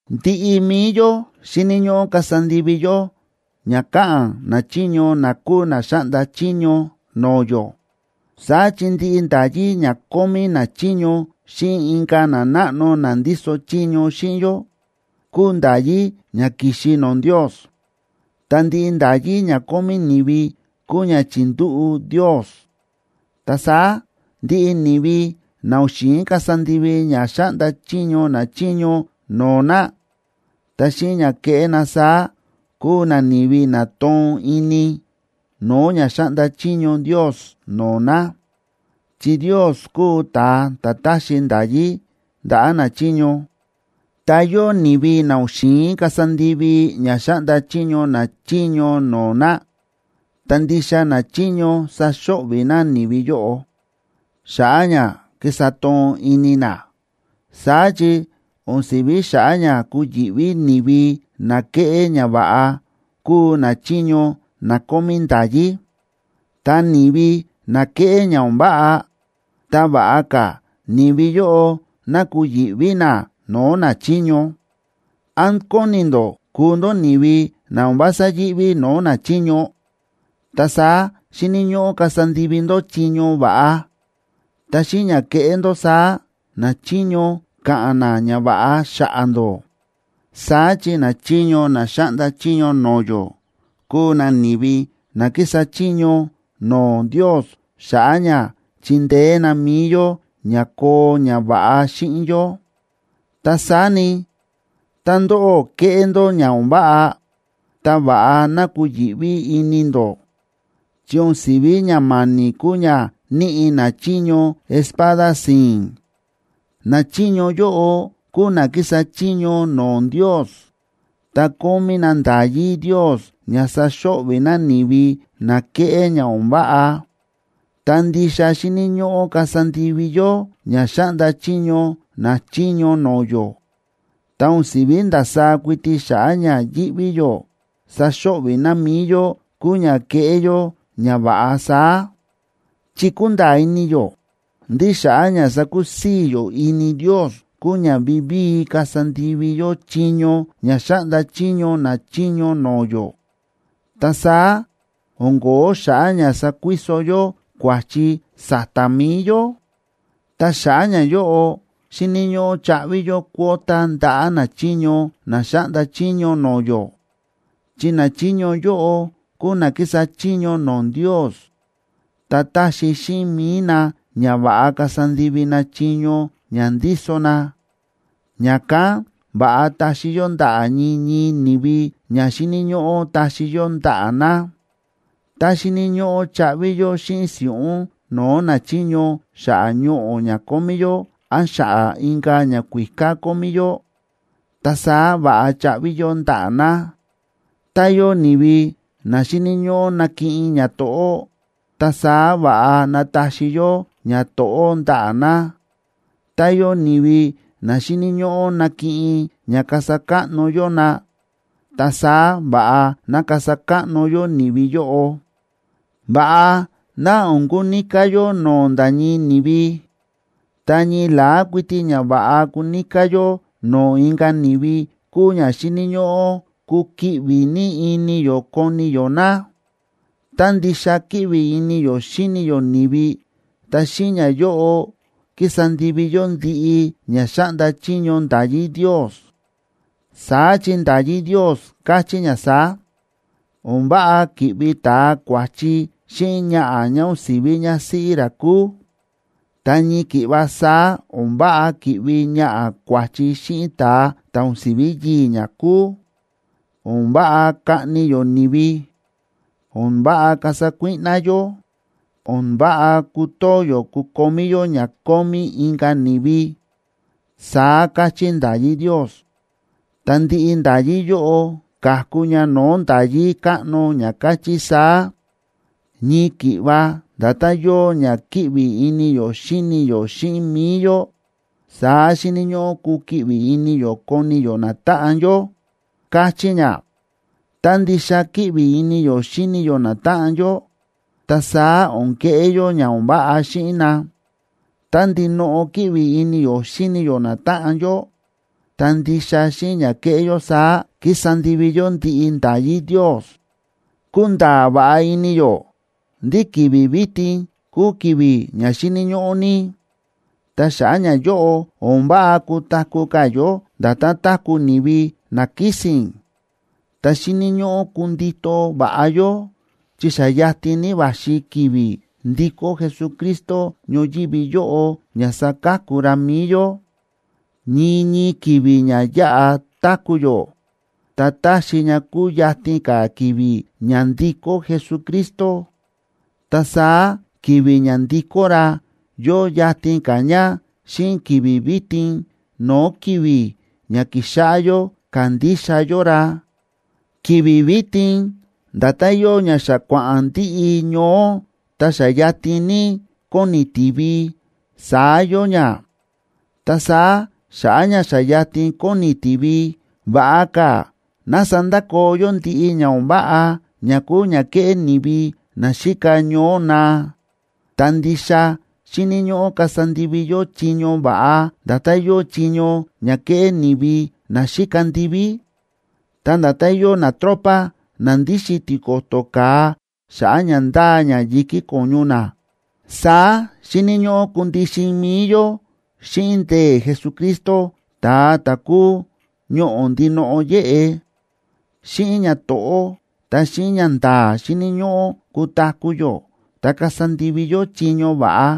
Ndiꞌi mi̱i yó xíni̱ ñóꞌó kasa ndivi yó ña káꞌa̱n nachiño na kúu na xáꞌnda chiño no̱o̱ yó. Saá chi ndiꞌi nda̱yí ña kómí nachiño xíꞌin inka̱ nanáꞌno na ndíso chiño xíꞌin yó, kúu nda̱yí ña ki̱xi no̱o̱ Ndios. Ta ndiꞌi nda̱yí ña kómí ni̱vi kúu ña chi̱ndúꞌu̱ Ndios. Ta saá ndiꞌi ni̱vi na o̱n xi̱in kasa ndivi ña xáꞌnda chiño nachiño no̱o̱ na, ta xíꞌin ña kéꞌé na saá, kúu na ni̱vi na toon ini no̱o̱ ña xáꞌnda chiño Ndios no̱o̱ na, chi Ndios kúu ta̱a ta̱ táxi nda̱yí ndaꞌa̱ nachiño. Ta yóo ni̱vi na o̱n xi̱in kasa ndivi ña xáꞌnda chiño nachiño no̱o̱ na, ta ndixa nachiño saxo̱ꞌvi̱ na ni̱vi yóꞌo xa̱ꞌa̱ ña ki̱sa toon ini na. Saá chi o̱n si̱ví xa̱ꞌa̱ ña kuyi̱ꞌví ni̱vi na kéꞌé ñava̱ꞌa, kúu nachiño na kómí nda̱yí. Ta ni̱vi na kéꞌé ña o̱n váꞌa, ta va̱ꞌa ka̱ ni̱vi yóꞌo ná kuyi̱ꞌví na no̱o̱ nachiño. ¿Án kóni ndó kuu ndó ni̱vi na o̱n vása yíꞌví no̱o̱ nachiño? Ta saá xíni̱ ñóꞌó kasa ndivi ndó chiño va̱ꞌa, ta xíꞌin ña kéꞌé ndó saá, nachiño ka̱ꞌa̱n na ñava̱ꞌa xa̱ꞌa̱ ndó. Saá chi nachiño na xáꞌnda chiño no̱o̱ yó kúu na ni̱vi na kísa chiño no̱o̱ Ndios xa̱ꞌa̱ ña chindeé na mi̱i yó ña koo ñava̱ꞌa xíꞌin yó. Ta saá ni, tá ndóꞌó kéꞌé ndó ña o̱n váꞌa, ta va̱ꞌa ná kuyi̱ꞌví ini ndó, chi o̱n si̱ví ña ma̱ni̱ kúu ña níꞌi nachiño espada si̱i̱n. Nachiño yóꞌo kúu na kísa chiño no̱o̱ Ndios, ta kómí na nda̱yí Ndios ña saxo̱ꞌvi̱ na ni̱vi na kéꞌé ña o̱n váꞌa. Ta ndixa xíni̱ ñóꞌó kasa ndivi yó ña xáꞌnda chiño nachiño no̱o̱ yó, ta o̱n si̱ví ndasaá kuiti xa̱ꞌa̱ ña yíꞌví yó saxo̱ꞌvi̱ na mi̱i yó kúu ña kéꞌé yó ñava̱ꞌa saá. Chi kúnda̱a̱ ini yó ndí xa̱ꞌa̱ ña sakusii̱ yó ini Ndios kúu ña vivíi kasa ndivi yó chiño ña xáꞌnda chiño nachiño no̱o̱ yó, ta saá o̱n ko̱ó xa̱ꞌa̱ ña sakuiso yó kua̱chi sa̱ta̱ mi̱i yó. Ta xa̱ꞌa̱ ñayóꞌo, xíni̱ ñóꞌó chaꞌvi yó cuota ndaꞌa̱ nachiño na xáꞌnda chiño no̱o̱ yó. Chi nachiño yóꞌo kúu na kísa chiño no̱o̱ Ndios, ta táxi xíꞌin mi̱i na ña va̱ꞌa kasa ndivi na chiño ña ndíso na. Ña̱kán va̱ꞌa taxi yó ndaꞌa̱ ñii ñii ni̱vi ña xíni̱ ñóꞌó taxi yó ndaꞌa̱ na. Tá xíni̱ ñóꞌó chaꞌvi yó xíꞌin si̱ꞌún no̱o̱ nachiño xa̱ꞌa̱ ñoꞌo̱ ña kómí yó án xa̱ꞌa̱ inka̱ ñakuíká kómí yó, ta saá va̱ꞌa chaꞌvi yó ndaꞌa̱ na. Tá yóo ni̱vi na xíni̱ ñóꞌó nakiꞌin ñato̱ꞌó, ta saá va̱ꞌa ná taxi yó ñato̱ꞌó ndaꞌa̱ na. Tá yóo ni̱vi na xíni̱ ñóꞌó nakiꞌin ña kasa káꞌno yó na, ta saá va̱ꞌa ná kasa káꞌno yó ni̱vi yóꞌo. Va̱ꞌa ná o̱n kuníká yó no̱o̱ nda̱ ñii ni̱vi. Ta ñii la̱á kuiti ña va̱ꞌa kuníká yó no̱o̱ inka̱ ni̱vi kúu ña xíni̱ ñóꞌó kukiꞌvi ní ini yó koni yó na. Tá ndixa kíꞌvi ini yó xíni yó ni̱vi, ta xíꞌin ñayóꞌo ki̱sa ndivi yó ndiꞌi ña xáꞌnda chiño nda̱yí Ndios. Saá chi nda̱yí Ndios káchí ña saá: “O̱n váꞌa ki̱ꞌvi ta̱a kua̱chi xíꞌin ñaꞌa̱ ñá o̱n si̱ví ñásíꞌí ra kúu; ta ñii ki̱ꞌva saá o̱n váꞌa ki̱ꞌvi ñaꞌa̱ kua̱chi xíꞌin ta̱a ta̱ o̱n si̱ví yii̱ ñá kúu; o̱n váꞌa kaꞌni yó ni̱vi; o̱n váꞌa kasa kuíꞌná yó; o̱n váꞌa kutoo yó kukomí yó ña kómí inka̱ ni̱vi”, saá káchí nda̱yí Ndios. Ta ndiꞌi nda̱yí yóꞌo ka̱ku ña no̱o̱ nda̱yí káꞌno ña káchí saá: “Ñii ki̱ꞌva nda̱tán yóo ña kíꞌvi ini yó xíni yó xíꞌin mi̱i yó, saá xíni̱ ñóꞌó kukiꞌvi ini yó koni yó natáꞌan yó”, káchí ña. Tá ndixa kíꞌvi ini yó xíni yó natáꞌan yó, ta saá o̱n keꞌé yó ña o̱n váꞌa xíꞌin na. Tá ndinoꞌo kíꞌvi ini yó xíni yó natáꞌan yó, ta ndixa xíꞌin ña kéꞌé yó saá, kísa ndivi yó ndiꞌi nda̱yí Ndios. Kúnda̱a̱ va̱ꞌa ini yó ndí ki̱vi̱ vitin kúu ki̱vi̱ ña xíni̱ ñóꞌó ní, ta xa̱ꞌa̱ ñayóꞌo o̱n váꞌa kutaku̱ ka̱ yó nda̱tán táku̱ ni̱vi na kísi̱n. Ta xíni̱ ñóꞌó kundito va̱ꞌa yó, chi xa yatin ní va̱xi ki̱vi̱ ndikó Jesucristo ñoyívi yóꞌo ña saka̱ku ra mi̱i yó. Ñii ñii ki̱vi̱ ña yáꞌa táku̱ yó, ta táxi ña kuyatin ka̱ ki̱vi̱ ña ndikó Jesucristo. Ta saá ki̱vi̱ ña ndikó ra yóo yatin ka̱ ña xíꞌin ki̱vi̱ vitin no̱o̱ ki̱vi̱ ña ki̱xáꞌá yó kándixa yó ra. Ki̱vi̱ vitin nda̱tán yóo ña xa kua̱ꞌa̱n ndiꞌi ñoó ta xa yatin ní kóni tiví, saá yóo ña. Ta saá xa̱ꞌa̱ ña xa yatin kóni tiví, va̱ꞌa ka̱ ná sandakoo yó ndiꞌi ña o̱n váꞌa ña kúu ña kéꞌé ni̱vi na xíka ñoó naa, ta ndixa xíni̱ ñóꞌó kasa ndivi yó chiño va̱ꞌa, nda̱tán yóo chiño ña kéꞌé ni̱vi na xíka ndiví. Ta nda̱tán yóo natropa na ndíxin tiko̱to̱ ka̱a xa̱ꞌa̱ ña ndáa ña yi̱kí ko̱ñu na, saá xíni̱ ñóꞌó kundixin mi̱i yó xíꞌin ndee̱ Jesucristo, ta̱a ta̱ kúu ñoꞌo̱ ndinoꞌo yéꞌe. Xíꞌin ñato̱ꞌó ta xíꞌin ñanda̱a̱ xíni̱ ñóꞌó kutaku̱ yó ta kasa ndivi yó chiño va̱ꞌa,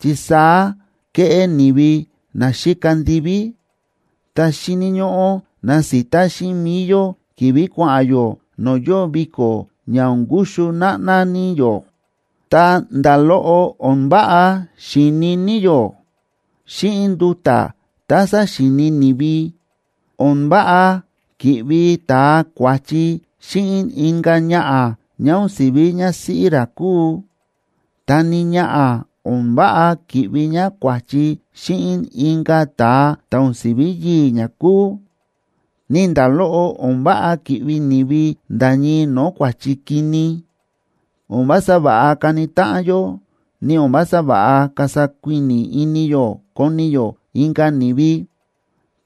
chi saá kéꞌé ni̱vi na xíka ndiví. Ta xíni̱ ñóꞌó nasita xíꞌin mi̱i yó ki̱vi̱ kua̱ꞌa̱n yó no̱o̱ yóo viko̱ ña o̱n kuxu náꞌná ní yó, ta nda̱ loꞌo o̱n váꞌa xíini ní yó xíꞌin nduta̱ tá saxíini ni̱vi. O̱n váꞌa ki̱ꞌvi ta̱a kua̱chi xíꞌin inka̱ ñaꞌa̱ ñá o̱n si̱ví ñásíꞌí ra kúu, ta ni ñaꞌa̱ o̱n váꞌa ki̱ꞌvi ñá kua̱chi xíꞌin inka̱ ta̱a ta̱ o̱n si̱ví yii̱ ñá kúu, ni nda̱ loꞌo o̱n váꞌa ki̱ꞌvi ni̱vi nda̱ ñii no̱o̱ kua̱chi kini. O̱n vása va̱ꞌa kani táꞌan yó, ni o̱n vása va̱ꞌa kasa kuíni̱ ini yó koni yó inka̱ ni̱vi.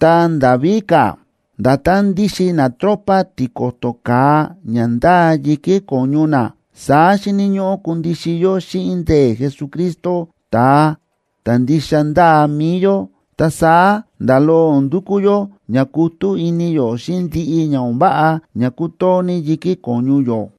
Ta nda̱ víka̱, nda̱tán ndíxin natropa tiko̱to̱ ka̱a ña ndáa yi̱kí ko̱ñu na, saá xíni̱ ñóꞌó kundixin yó xíꞌin ndee̱ Jesucristo ta̱a ta̱ ndixa ndáa mi̱i yó. Ta saá nda̱ loꞌo o̱n ndukú yó ña kutú ini yó xíꞌin ndiꞌi ña o̱n váꞌa ña kútoo ní yi̱kí ko̱ñu yó.